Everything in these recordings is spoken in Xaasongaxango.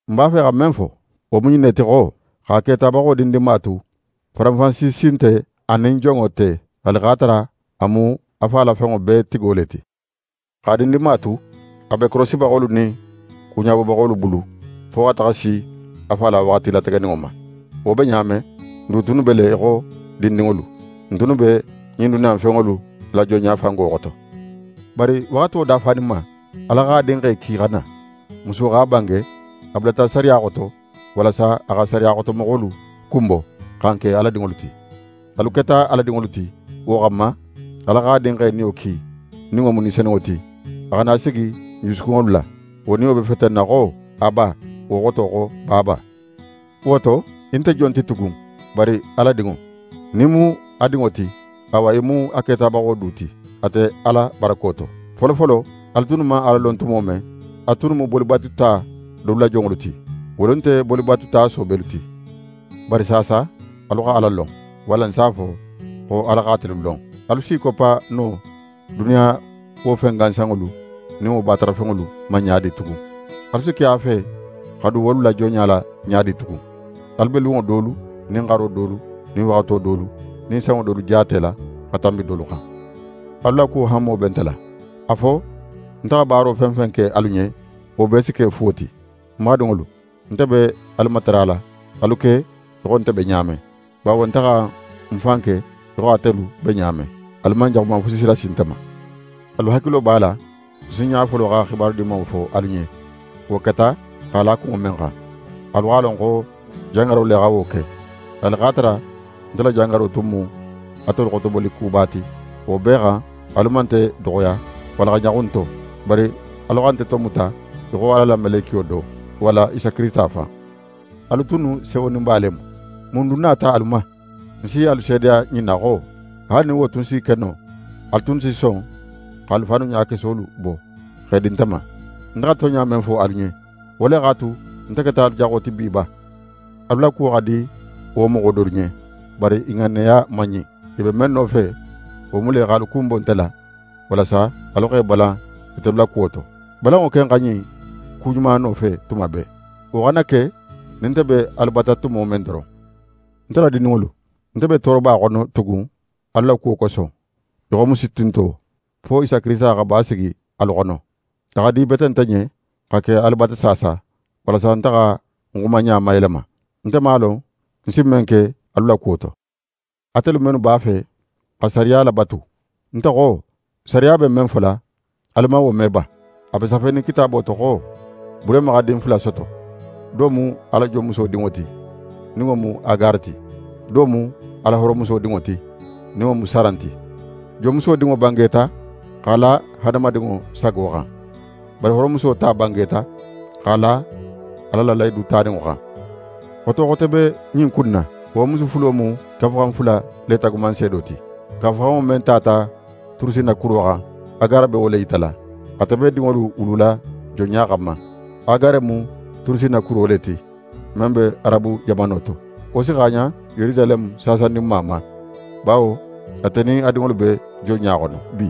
Ń b'a fe xa men fo, wo mu ɲin ne ti xo: Xa ketabaxo dindinma tu, faranfansi si nte a nin jonŋo te, haali x'a tara a mu a fa la fenŋo bee tigo le ti. X'a dindinma tu, a be korosibaxolu nin kuɲabobaxolu bulu, fo xa taxa si a fa la waxati lategeninŋo ma. Wo be ɲa men, n du tunnu be le í xo dindinŋolu. N tunnu be ɲin duniya in fenŋolu la jonɲafango xoto. Bari waxato dafaninma, Ala x'a Dinxe ki xa na: Muso x'a bange, a bulata sariya xoto, walasa a xa sariya xotomoxolu kunbo, xa n ke Ala dinŋolu ti. Alu keta Ala dinŋolu ti, wo xanma, Ala x'a Dinxe Niyo ki, nin wo mu Ni Senunŋo ti, a xa na sigi n jusukunŋolu la. Wo Niyo be fetenna xo: «Aba!» Wo xoto xo: «Baaba!» Wo to, í nte jon ti tugun, bari Ala dinŋo. Nin í mu a dinŋo ti, awa í mu a ketabaxo du ti, ate Ala barako to. Folofolo, alu tunnu man Ala lon tumo men, alu tunnu mu bolibatuta dolu la jonŋolu ti. Wolu nte bolibatuta soobelu ti. Bari saasa alu xa Ala lon. Walla ń s'a fo xo Ala x'atelu lon. Alu s'i koppa no duniya la wo fen gansanŋolu nin wo batarafenŋolu ma ɲa di tugun? Alu si ke a fe xa dun wolu la jonɲa la ɲa di tugun? Alu be lunŋo dolu nin xaro dolu nin waxato dolu nin sanŋo dolu jaatela xa tanbi dolu xan. Alu la kuwo hanmo be nte la. A fo nte xa baaro fen fen ke alu ɲen, wo bee si ke fuwo ti? Ń badinŋolu, ń be alu matarala, alu ke í xo nte be ɲa men, bawo nte xa ń fan ke í xo atelu be ɲa men. Alu man jaxuman fusi lasi nte ma. Alu hakilo b'a la, ń sinɲa folo xa xibaru Dimanŋo fo alu ɲen, wo keta x'a la kunŋo men xan: Alu x'a lon xo jangaro le xa wo ke. Haali x'a tara nte la jangaro tun mu atelu xotoboli kuba ti, wo bee xan alu man nte doxoya walla xa ɲaxun ń to; bari alu xa nte tomuta í xo Ala la melekiyo do, walla Isa Kirisita fan. Alu tunnu sewoninba le mu! Mun dun nata alu ma? Ń si alu seedeya ɲin na xo: Haali nin wo tun si ke no, alu tunnu si son x'alu fannu ɲakesolu bo, x'e di nte ma. Nte xa tonɲa men fo alu ɲen, wo le x'a tu nte keta alu jaxo ti bi ba? Alu la kuwo xa di wo moxo dolu ɲen; bari i ŋanneya man ɲin. I be men nofe, wo mu le x'alu kunbo nte la, walasa alu x'e balan itelu la kuwo to. Balanŋo ken xa ɲin ku ɲuma nofe tuma bee, wo xana ke nin nte be alu bata tumo men doron. Nte la dindinŋolu, nte be tooroba xono tugun alu la kuwo koso, í xo musu tinto, fo Isa Kirisita xa basigi alu xono. A xa di bete nte ɲen, xa ke alu bata saasa; walasa nte xa ń xumaɲa mayelema. Nte man a lon ń si men ke alu la kuwo to. Atelu mennu b'a fe xa sariya labatu, nte xo sariya be men fola, alu man wo me ba? A be safenin Kitaabo to xo Burehima xa din fula soto. Do mu a la jonmuso dinŋo ti, nin wo mu Agare ti. Do mu a la hooromuso dinŋo ti, nin wo mu Saran ti. Jonmuso dinŋo bangeta x'a la hadamadinŋo sago xan. Bari hooromuso ta bangeta x'a la Ala la lahidu taninŋo xan. Xoto xote be ɲin ku in na. Wo musu fulo mu Kafuxan fula le taagumanseedo ti. Kafuxanŋo men tata Turusinna kuro xan, Agare be wo le yitala. Ate be dinŋolu wulula jonɲa xanma. Agare mu Turusinna kuro le ti, men be Arabu jamano to. Wo si xaaɲan Yerusaleme saasandinma ma, bawo ate nin a dinŋolu be jonɲa xono bi.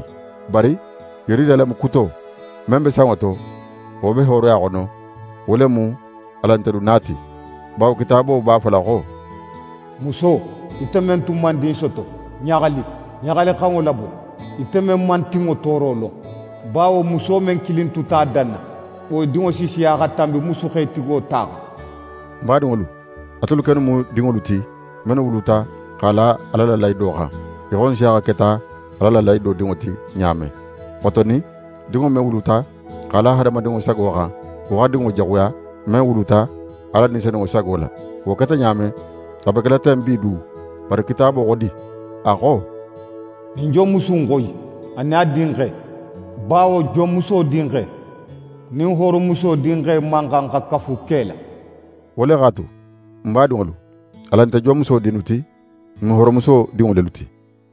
Bari Yerusaleme kuto, men be sanŋo to, wo be hooroya xono, wo le mu alan ntelu na ti. Bawo Kitaabo b'a fola xo: «Muso, ite men tun man din soto, ɲaxali. Ɲaxalixanŋo labo, ite men man tinŋo tooro lon; bawo muso men kilin tuta a danna, wo dinŋo si siya xa tanbi musu xetigo ta xan.» Ń badinŋolu, atelu kennu mu dinŋolu ti, mennu wuluta x'a la Ala la lahido xan, í xo Nsiyaxa keta Ala la lahido dinŋo ti ɲa men. Xotonin, dinŋo men wuluta x'a la hadamadinŋo sago xan, wo xa dinŋo jaxuya, men wuluta Ala Ni Senunŋo sago la. Wo keta ɲa men, a be kela ten bi du. Bari Kitaabo xo di? A xo: «Ɲin jonmusu in xoyi, a nin a dinxe; bawo jonmuso dinxe nin hooromuso dinxe man xan xa kafu ke la.» Wo le x'a tu, ń badinŋolu, alan nte jonmuso dinnu ti, n mu hooromuso dinŋo lelu ti.